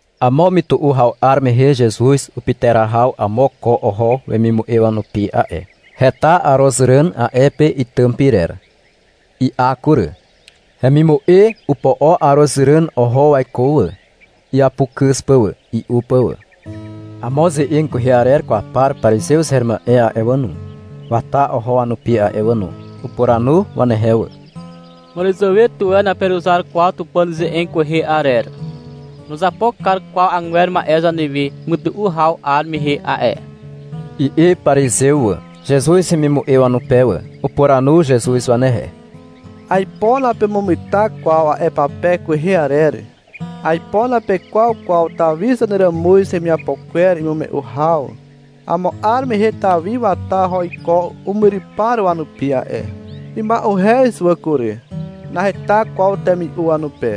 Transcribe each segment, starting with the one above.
Amo mytu'u haw 'ar mehe Zezuz upyterahaw amo ko oho wemimu'e wanupi a'e. Heta arozràn a'e pe itym pyrer. I'a kury. Hemimu'e opo'o arozràn oho waiko wà, iapukyz pà wà, i'u pà wà. Amo ze'eg kwehe arer kwaw par parizew her ma'e a'e wà no, wata oho wanupi a'e wà no. Upuranu wanehe wà. — Màràzàwe tuwe naperuzar kwaw Tupàn ze'eg kwehe arer. Nuzapo kar kwaw agwer ma'e zanewe mytu'u haw 'ar mehe a'e, i'i parizew wà, Zezuz hemimu'e wanupe wà. Upuranu Zezuz wanehe. — Aipo napemugeta kwaw a'e pape kwehe arer. Aipo napekwaw kwaw Tawi zaneràmuz hemiapo kwer imume'u haw. Amo 'ar mehe Tawi wata oho iko umyrypar wanupi a'e. Ima'uhez wà kury. Naheta kwaw temi'u wanupe.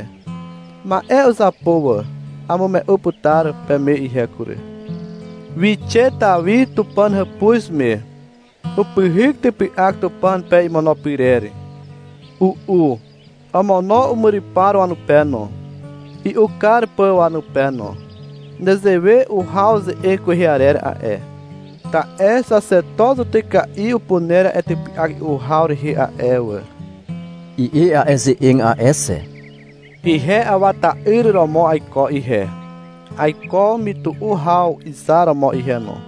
Ma'e uzapo wà. Amume'u putar peme ihe kury. Wixe Tawi Tupàn hàpuz me. Upyhyk typy'ak Tupàn pe imono pyrer. U'u. Omono umyrypar wanupe no, i'u kar pà wanupe no. Nezewe uhaw ze'eg kwehe arer a'e. Ta'e, — xaxeto zutyka'i upuner a'e typy'ak i'u haw rehe a'e wà, i'i a'e ze'eg a'e xe. — Ihe Awa ta'yr romo aiko ihe, aiko mytu'u haw izar romo ihe no.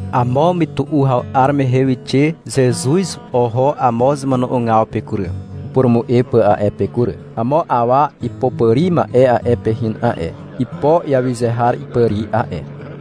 Amo mytu'u haw 'ar mehe wixe Zezuz oho amo zemono'ogaw pe kury, upurumu'e pà a'e pe kury. Amo awa ipopàri ma'e a'e pe hin a'e. Ipo iawyze har ipàri a'e.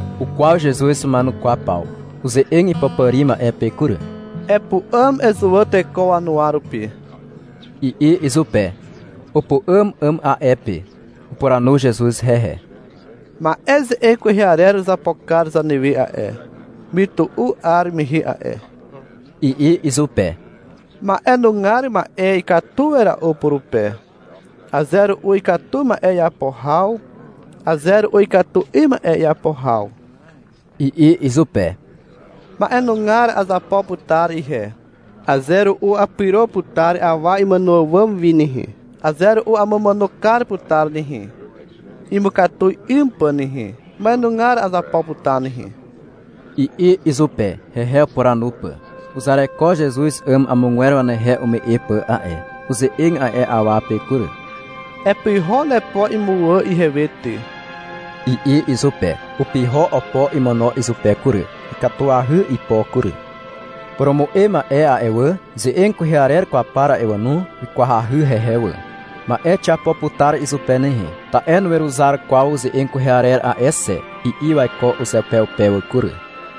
Ukwaw Zezuz wama'enukwaw paw. Uze'eg ipopàri ma'e pe kury. — Epu'àm ezuwà teko wanuwa rupi, i'i izupe. Upu'àm 'àm a'e pe. Upuranu Zezuz hehe. — Ma'e ze'eg kwehe arer uzapo kar zanewe a'e, mytu'u 'ar mehe a'e, i'i izupe. — Ma'e nugar ma'e ikatu wera'u purupe. Aze ru'u ikatu ma'e iapo haw, aze ru'u ikatu 'ym ma'e iapo haw, i'i izupe. — Ma'enugar azapo putar ihe, aze ru'u apyro putar awa imàno àwàm wi nehe, aze ru'u amumàno kar putar nehe, imukatu 'ym pà nehe. Ma'enugar azapo putar nehe, i'i izupe, hehe upuranu pà. Uzareko Zezuz 'àm amogwer wanehe ume'e pà a'e. Uze'eg a'e awa pe kury. — Epyho nepo imuwà ihewe ty, i'i izupe. Upyho opo imono izupe kury. Ikatuahy ipo kury. Purumu'e ma'e a'e wà, ze'eg kwehe arer kwaw par a'e wà no, wikwahy hehe wà. — Ma'e xiapo putar izupe nehe, ta'e nuweruzar kwaw ze'eg kwehe arer a'e xe, i'i waiko uzeupeupe wà kury.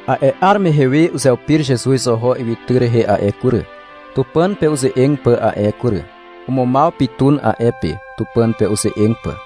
A'e 'ar mehe we uzeupir Zezuz oho ywytyr rehe a'e kury, Tupàn pe uze'eg pà a'e kury. Umumaw pytun a'e pe, Tupàn pe uze'eg pà.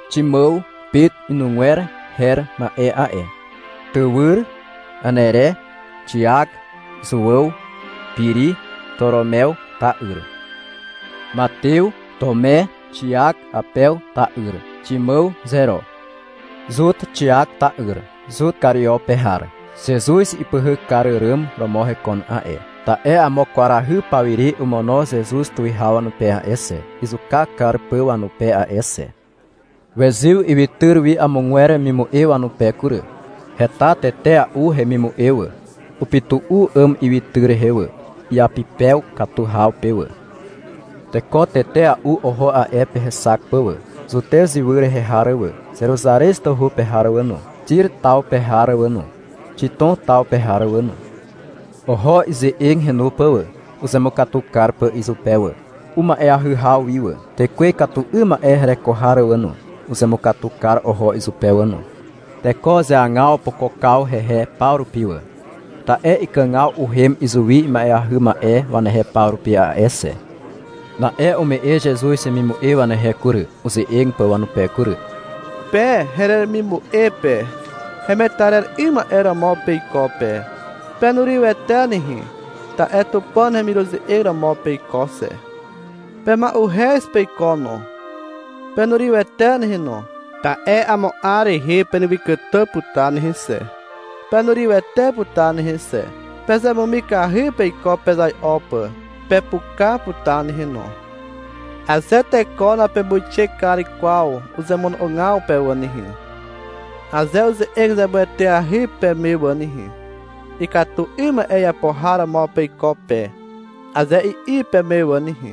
Ximàw (Pet inugwer her ma'e a'e), tywyr Anere, Xiak, Zuàw, Piri, Toromew ta'yr, Matew, Tume, Xiak Apew ta'yr, Ximàw Zero, Zut Xiak ta'yr, Zut Kario pe har. Zezuz ipyhyk kar àràm romo hekon a'e, (ta'e amo kwarahy pawire omono Zezuz tuwihaw wanupe a'e xe, izuka kar pà wanupe a'e xe.) Wezyw ywytyr wi amogwer wemimu'e wanupe kury. Heta tetea'u hemimu'e wà. Upytu'u 'àm ywytyr rehe wà, iapypew katu haw pe wà. Teko tetea'u oho a'e pe hexak pà wà. Zutez ywy rehe har wà, Zeruzarez tawhu pe har wà no, Xir taw pe har wà no, Xitom taw pe har wà no. Oho ize'eg henu pà wà, uzemukatu kar pà izupe wà, uma'eahy haw wi wà. Tekwe ikatu 'ym ma'e hereko har wà no, uzemukatu kar oho izupe wà no. Teko uzeagaw opokokaw hehe paw rupi wà, ta'e ikàgaw uhem izuwi ima'eahy ma'e wanehe paw rupi a'e xe. Na'e ume'e Zezuz wemimu'e wanehe kury, uze'eg pà wanupe kury. — Pe heremimu'e pe, hemetarer 'ym ma'e romo peiko pe. Penurywete nehe, ta'e Tupàn hemiruze'eg romo peiko xe. Pema'uhez peiko no, penurywete nehe no, ta'e amo 'ar rehe penewykàtà putar nehe xe, penurywete putar nehe xe. Pezemumikahy peiko pezai'o pà, pepuka putar nehe no. Aze teko napemuixe kar kwaw uzemono'ogaw pe wà nehe, aze uze'eg zemueteahy peme wà nehe, — Ikatu 'ym ma'e iapo har romo peiko pe, aze i'i peme wà nehe,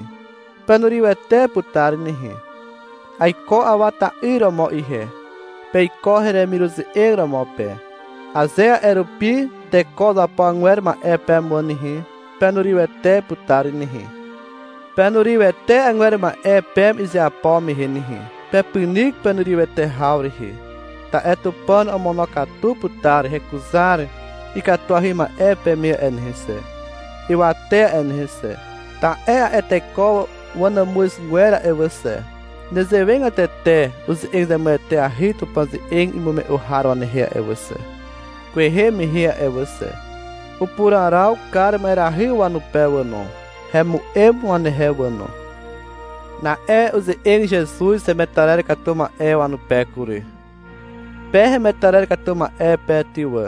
penurywete putar nehe. Aiko Awa ta'yr romo ihe. Peiko heremiruze'eg romo pe. Aze a'e rupi teko uzapo agwer ma'e peme wà nehe, penurywete putar nehe. Penurywete agwer ma'e peme izeapo mehe nehe, pepynyk penurywete haw rehe, ta'e Tupàn omonokatu putar hekuzar ikatuahy ma'e peme a'e nehe xe, ywate a'e nehe xe. Ta'e a'e teko wanàmuzgwer a'e wà xe, nezewegatete uze'eg zemueteahy Tupàn ze'eg imume'u har wanehe a'e wà xe, kwehe mehe a'e wà xe. Upuraraw kar ma'erahy wanupe wà no. Hemu'em wanehe wà no. Na'e uze'eg Zezuz hemetarer katu ma'e wanupe kury. — Pe hemetarer katu ma'e pe ty wà,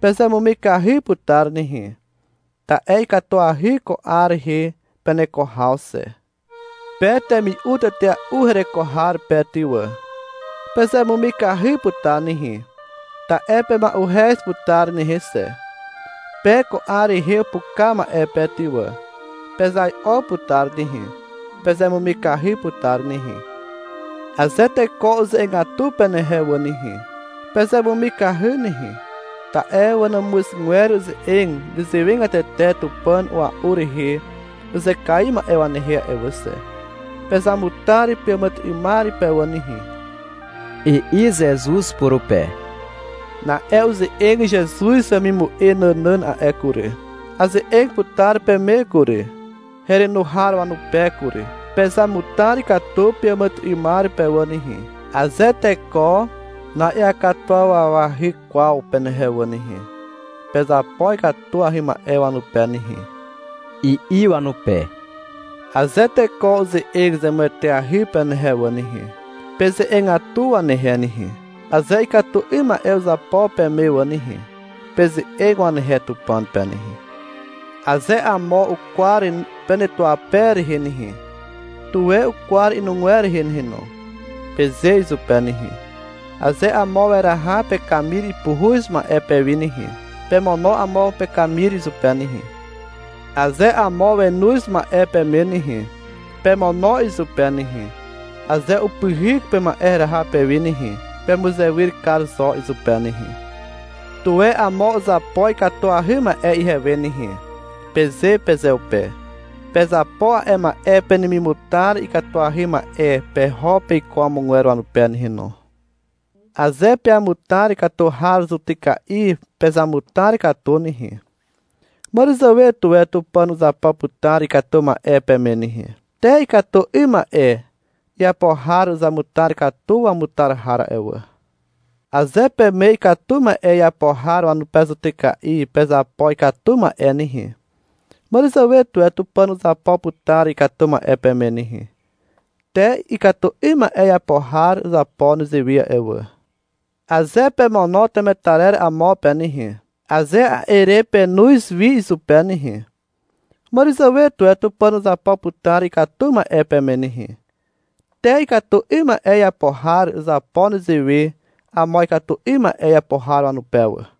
pezemumikahy putar nehe, ta'e ikatuahy ko 'ar rehe peneko haw xe. Pe temi'u tetea'u hereko har pe ty wà, pezemumikahy putar nehe, ta'e pema'uhez putar nehe xe. Pe ko 'ar rehe upuka ma'e pe ty wà, pezai'o putar nehe, pezemumikahy putar nehe. Aze teko uze'egatu penehe wà nehe, pezemumikahy nehe, ta'e wanàmuzgwer uze'eg nezewegatete Tupàn a'ua'u rehe uzekaiw ma'e wanehe a'e wà xe. Pezamutar peàmàtyry'ymar pe wà nehe, i'i Zezuz purupe. Na'e uze'eg Zezuz wemimu'e nànàn a'e kury. — Aze'eg putar peme kury, herenu har wanupe kury. Pezamutar katu peàmàtyry'ymar pe wà nehe. Aze teko na'iakatuwawahy kwaw penehe wà nehe, pezapo ikatuahy ma'e wanupe nehe, i'i wanupe. Aze teko uze'eg zemueteahy penehe wà nehe, peze'egatu wanehe nehe. Aze ikatu 'ym ma'e uzapo peme wà nehe, peze'eg wanehe Tupàn pe nehe. Aze amo ukwar penetuape rehe nehe, tuwe ukwar inugwer rehe nehe no, peze izupe nehe. Aze amo weraha pekamir puhuz ma'e pewi nehe, pemono amo pekamir izupe nehe. Aze amo wenoz ma'e peme nehe, pemono izupe nehe. Aze upyhyk pema'e heraha pewi nehe, pemuzewyr kar zo izupe nehe. Tuwe amo uzapo ikatuahy ma'e ihewe nehe, peze pezeupe. Pezapo a'e ma'e penemimutar ikatuahy ma'e peho peiko amogwer wanupe nehe no. Aze peamutar katu har zutyka'i pezamutar katu nehe, màràzàwe tuwe Tupàn uzapo putar ikatu ma'e peme nehe. Te ikatu 'ym ma'e iapo har uzamutar katu wamutar har a'e wà. Aze peme ikatu ma'e iapo har wanupe zutyka'i pezapo ikatu ma'e nehe, màràzàwe tuwe Tupàn uzapo putar ikatu ma'e peme nehe. Te ikatu 'ym ma'e iapo har uzapo nezewe a'e wà. Aze pemono temetarer amo pe nehe, aze a'e re penoz wi izupe nehe, màràzàwe tuwe Tupàn uzapo putar ikatu ma'e peme nehe. Te ikatu 'ym ma'e iapo har uzapo nezewe amo ikatu 'ym ma'e iapo har wanupe wà.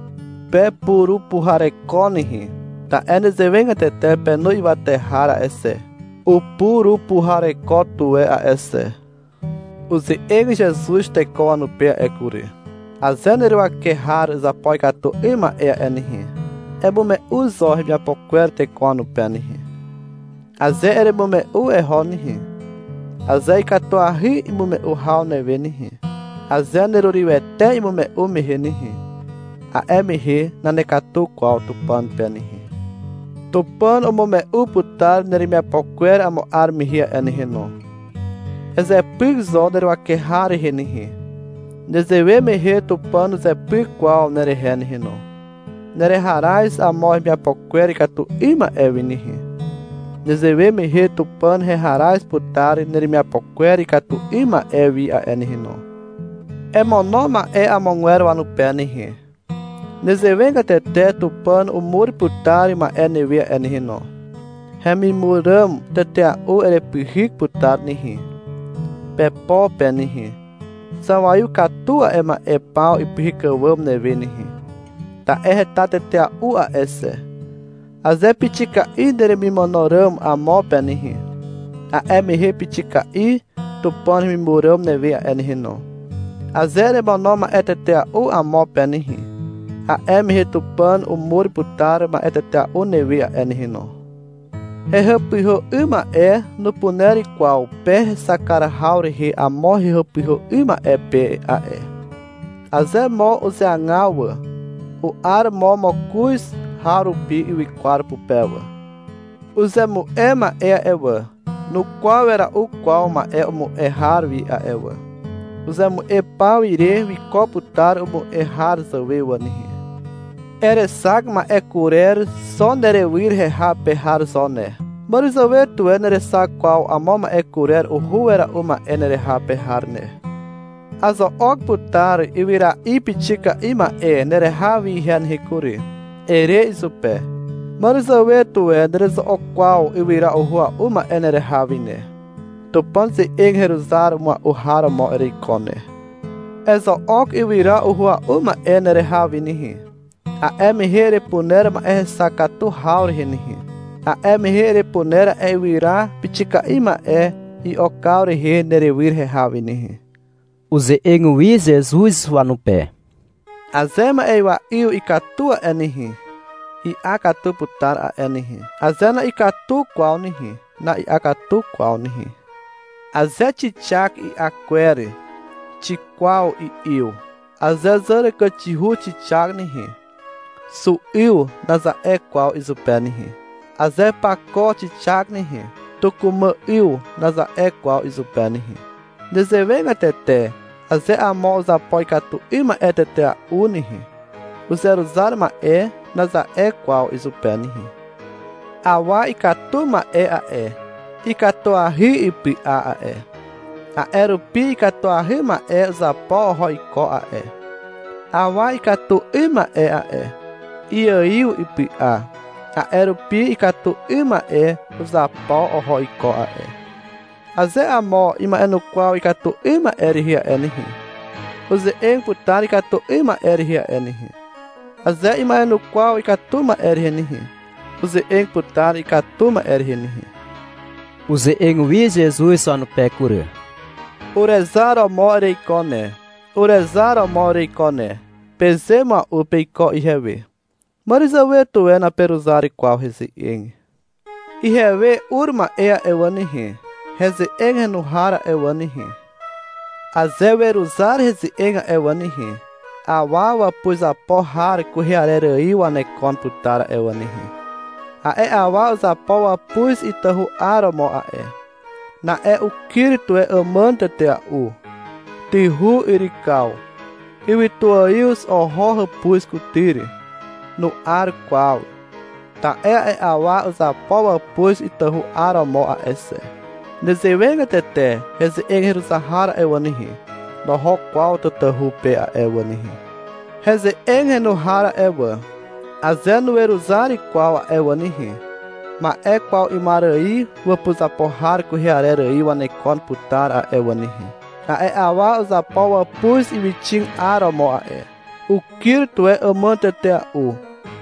Pepurupuhareko nehe. Ta'e nezewegatete penu ywate har a'e xe, upurupuhareko tuwe a'e xe. Uze'eg Zezuz teko wanupe a'e kury. — Aze neruwake har uzapo ikatu 'ym ma'e a'e nehe, emume'u zo hemiapo kwer teko wanupe nehe. Aze eremume'u eho nehe, aze ikatuahy imume'u haw newe nehe, aze nerurywete imume'u mehe nehe, a'e mehe nanekatu kwaw Tupàn pe nehe. Tupàn umume'u putar neremiapo kwer amo 'ar mehe a'e nehe no. Ezepyk zo neruwake har rehe nehe. Nezewe mehe Tupàn nuzepyk kwaw nerehe nehe no. Nereharaz amo hemiapo kwer ikatu 'ym ma'e wi nehe. Nezewe mehe Tupàn heharaz putar neremiapo kwer ikatu 'ym ma'e wi a'e nehe no. Emono ma'e amogwer wanupe nehe. Nezewegatete Tupàn umur putar ma'e newe a'e nehe no. Hemimur ràm tetea'u erepyhyk putar nehe, pepo pe nehe. Zawaiw katu a'e ma'e paw ipyhyk àwàm newe nehe. Ta'e heta tetea'u a'e xe. Aze pixika'i neremimono ràm amo pe nehe, a'e mehe pixika'i Tupàn hemimur ràm newe a'e nehe no. Aze eremono ma'e tetea'u amo pe nehe, a'e mehe Tupàn umur putar ma'e tetea'u newe a'e nehe no. Hehàpyhà 'ym ma'e nupuner kwaw pe hexak kar haw rehe amo hehàpyhà 'ym ma'e pe a'e. Aze mo uzeagaw wà, u'ar mo mokoz harupi ywykwar pupe wà. Uzemu'e ma'e a'e wà, nukwaw wera'u kwaw ma'e umu'e har wi a'e wà. Uzemu'e paw ire wiko putar umu'e har zàwe wà nehe. Erexak ma'e kurer xo nerywyr heha pe har zo ne. Màràzàwe tuwe nerexak kwaw amo ma'e kurer uhua'u ma'e nereha pe har ne. — Azo'ok putar ywyra'i pixika'i ma'e nereha wi ihe nehe kury, ere izupe. Màràzàwe tuwe nerezo'ok kwaw ywyra uhua'u ma'e nereha wi nehe. Tupàn ze'eg heruzar mua'u har romo ereiko ne. Ezo'ok ywyra uhua'u ma'e nereha wi nehe. A'e mehe erepuner ma'e hexak katu haw rehe nehe. A'e mehe erepuner a'e ywyra pixika'i ma'e i'okaw rehe nerywyr heha wi nehe. Uze'eg wi Zezuz wanupe. — Aze ma'ywa 'yw ikatu a'e nehe, i'a katu putar a'e nehe. Aze na'ikatu kwaw nehe, na'i'a katu kwaw nehe. Aze xixak i'a kwer, xikwaw i'yw. (Aze zàràkàxihu xixak nehe, — Xu 'yw, naza'e kwaw izupe nehe. Aze pako xixak nehe, — Tukumà 'yw, naza'e kwaw izupe nehe.) Nezewegatete aze amo uzapo ikatu 'ym ma'e tetea'u nehe, — Uzeruzar ma'e, naza'e kwaw izupe nehe. Awa ikatu ma'e a'e, ikatuahy ipy'a a'e, a'e rupi ikatuahy ma'e uzapo oho iko a'e. Awa ikatu 'ym ma'e a'e, iaiw ipy'a, a'e rupi ikatu 'ym ma'e uzapo oho iko a'e. Aze amo ima'enukwaw ikatu 'ym ma'e rehe a'e nehe, uze'eg putar ikatu 'ym ma'e rehe a'e nehe. Aze ima'enukwaw ikatu ma'e rehe nehe, uze'eg putar ikatu ma'e rehe nehe. Uze'eg wi Zezuz wanupe kury. — Urezar romo ereiko ne, urezar romo ereiko ne, peze mua'u peiko ihewe. Màràzàwe tuwe naperuzar kwaw heze'eg. Ihewe ur ma'e a'e wà nehe, heze'eg henu har a'e wà nehe, aze weruzar heze'eg a'e wà nehe, awa wàpuzapo har kwehe arer ài wanekon putar a'e wà nehe. A'e awa uzapo wàpuz itahu 'aromo a'e. Na'e ukyr tuwe àmàn tetea'u. Tyhu yrykaw. Ywytuaiw oho hàpuz kutyr. Nu'ar kwaw, ta'e a'e awa uzapo wàpuz itahu 'aromo a'e xe. (Nezewegatete heze'eg heruzar har a'e wà nehe, noho kwaw tatahu pe a'e wà nehe.) Heze'eg henu har a'e wà, aze nuweruzar kwaw a'e wà nehe, ma'e kwaw 'ymar ài wàpuzapo har kwehe arer ài wanekon putar a'e wà nehe. A'e awa uzapo wàpuz ywyxig 'aromo a'e. Ukyr tuwe àmàn tetea'u.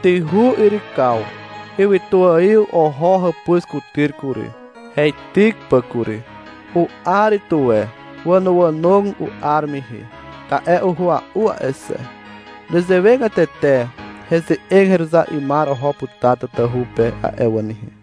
Tyhu yrykaw. Ywytuaiw oho hàpuz kutyr kury, heityk pà kury. U'ar tuwe. Wànoànog u'ar mehe, ta'e uhua'u a'e xe. (Nezewegatete heze'eg heruzar 'ymar oho putar tatahu pe a'e wà nehe.)